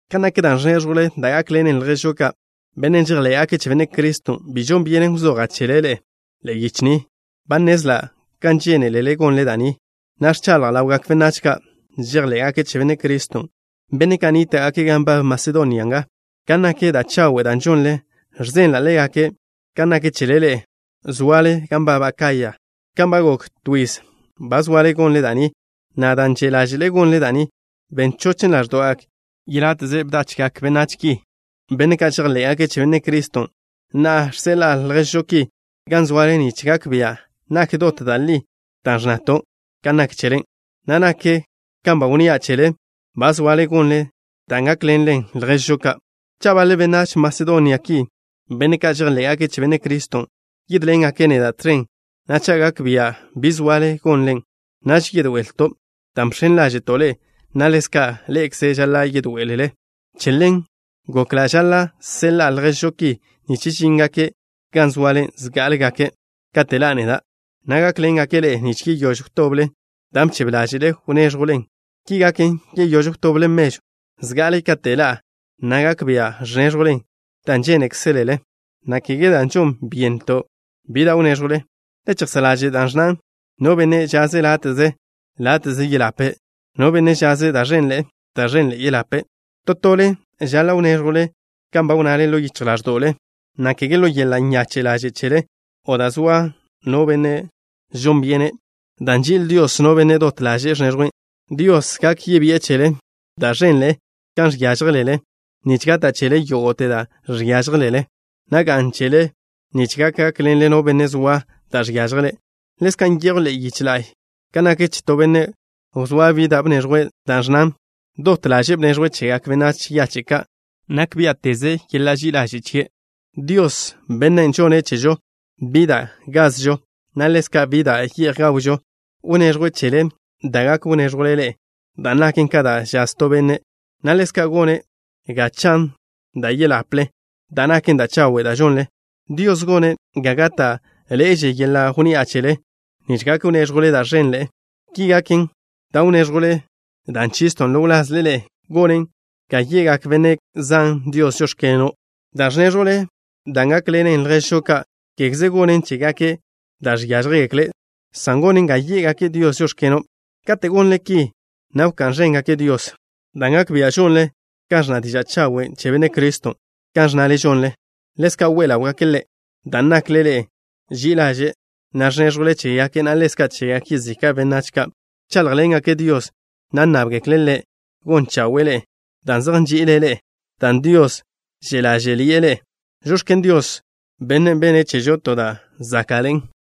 Kan nak da' ẕnéẕjwle da' gákḻenen lježžo ka', benne' žejḻé'gake' che Benne' Criston', bi žon byenen wzoja' chele ḻe'e, ḻe'e yiche ni. Ba nnezla' kan žénelele gonle da' ni, na' ẕchaḻja' ḻawgak benách ka' žejḻé'gake' che Benne' Criston', benne' ka' nníta'gake' gan nbab Masedonia nga, kan nak da' chawe' da' žonle. Ẕzenla' ḻégake' kan nak chele ḻe'e, zoale gan nbab Acaya, kan ba gok to yiz ba zoale gonle da' ni, na' dan' že' ḻáže'le gonle da' ni, ben chochen ḻáẕdo'gak yeláte'ze bdachgak benách ki, benne' ka' žejḻé'gake' che Benne' Criston'. Na'a, žseḻa'a lježžo ki gan zoale nich gak bia' nak dot da' li da' ẕnnato' kan nak chele, na' nak kan ba wnnía' chele, ba zoale gonle dan' gákḻenen lježžo ka'. Cha' baḻe benách Masedonia ki, benne' ka' žejḻé'gake' che Benne' Criston', yídḻengake' neda' tẕen, na' cha' gak bia' bi zoale gonlen, naž yedoe'elto' dan' bx̱en ḻáže'to' ḻe'e, na' ḻezka' ḻe'ekze žaḻa' yedoé'elele. Che ḻen gokla' žaḻa' seḻa'a lježžo ki nich žíngake' gan zoale zgá'alegake' kate' ḻa'a neda', na' gákḻengake' ḻe'e nich yeyóž wtoble dan' bchebe ḻáže'le wnéẕjwlen. Ki gaken, yeyóž wtoble mežwn' zga'ale kate' ḻa'a, na' gak bia' ẕnéẕjwlen dan' žénekzelele, na' kege dan' žon byéneto' bi da' wnéẕjwle. Le chejsá' ḻaže' da' ẕnnan: No benne' žaze' láte'ze, láte'ze yeḻape'. No benne' žaze' da' ẕenḻe'e, da' ẕenḻe'e yeḻape'. To tole žaḻa' wnéẕjwle kan ba wnnale ḻo yichj ḻáẕdo'le, na' kege ḻo yeḻa' nyache' ḻaže' chele o dan' zoa no benne' žon byene', dan' nži'il Dios no benne' dot ḻaže'e ẕneẕjwe'. Dios gak yebi'e chele da' ẕenḻe'e kan žiážjelele nich gata' chele yógo'te dan' žiážjelele, na' ga'n chele nich gak gákḻenle no benne' zoa da' žiážjele'. Ḻezka' nyejw ḻe'e yiche la'y kan nak che to benne' wzóa bi da' bneẕjwe', da' ẕnnan: Dot ḻaže'e bneẕjwe' chegak benách yache' ka'. Nak biá'teze yeḻa' ži'i ḻaže' chie'. Dios, Bennen' žonne' chežo bi da' gazžo, na' ḻezka' bi da' ye'j gawžo, wneẕjwe' chele da' gak wnéẕjwle ḻe'e, dan' naken ka da' žaz to benne', na' ḻezka' gone' ga chan da' yeḻaple, da' naken da' chawe' da' žonlen. Dios gone' ga gáta'ḻe'eže yeḻa' wnni'a chele nich gak wnéẕjwle da' ẕenḻe'e. Ki gaken, dan' wnéẕjwle, dan' chiston' ḻo wlazle ḻe'e, gonen ga ye'gak benne' zan Dios: “Žóx̱keno'.” Da' ẕnéẕjwle dan' gákḻenen lježžo ka', kégeze gonnen chégake' da' žiážjegekle', san gonen ga yé'gake' Dios: “Žóx̱keno'.” Kate' gonle ki, na' wká'n ẕéngake' Dios dan' gak bia' žonle kan ẕnna diža' chawen' che Benne' Criston' kan ẕnnale žonle. Ḻezka' we ḻáwgake' Ḻe', dan' nakle ḻe'e ži'i ḻaže', na' ẕnéẕjwle chégake', na' ḻezka' chegak yezika' benách ka'. Wcháḻjḻengake' Dios, na' nnábgekle' Ḻe' gon chawe'e ḻe'e dan' zej nži'ile' ḻe'e dan' Dios že' ḻáže'ḻi'e ḻe'e. ¡Žox̱ken Dios, Bennen' benne' chežo to da' záka'ḻe'en!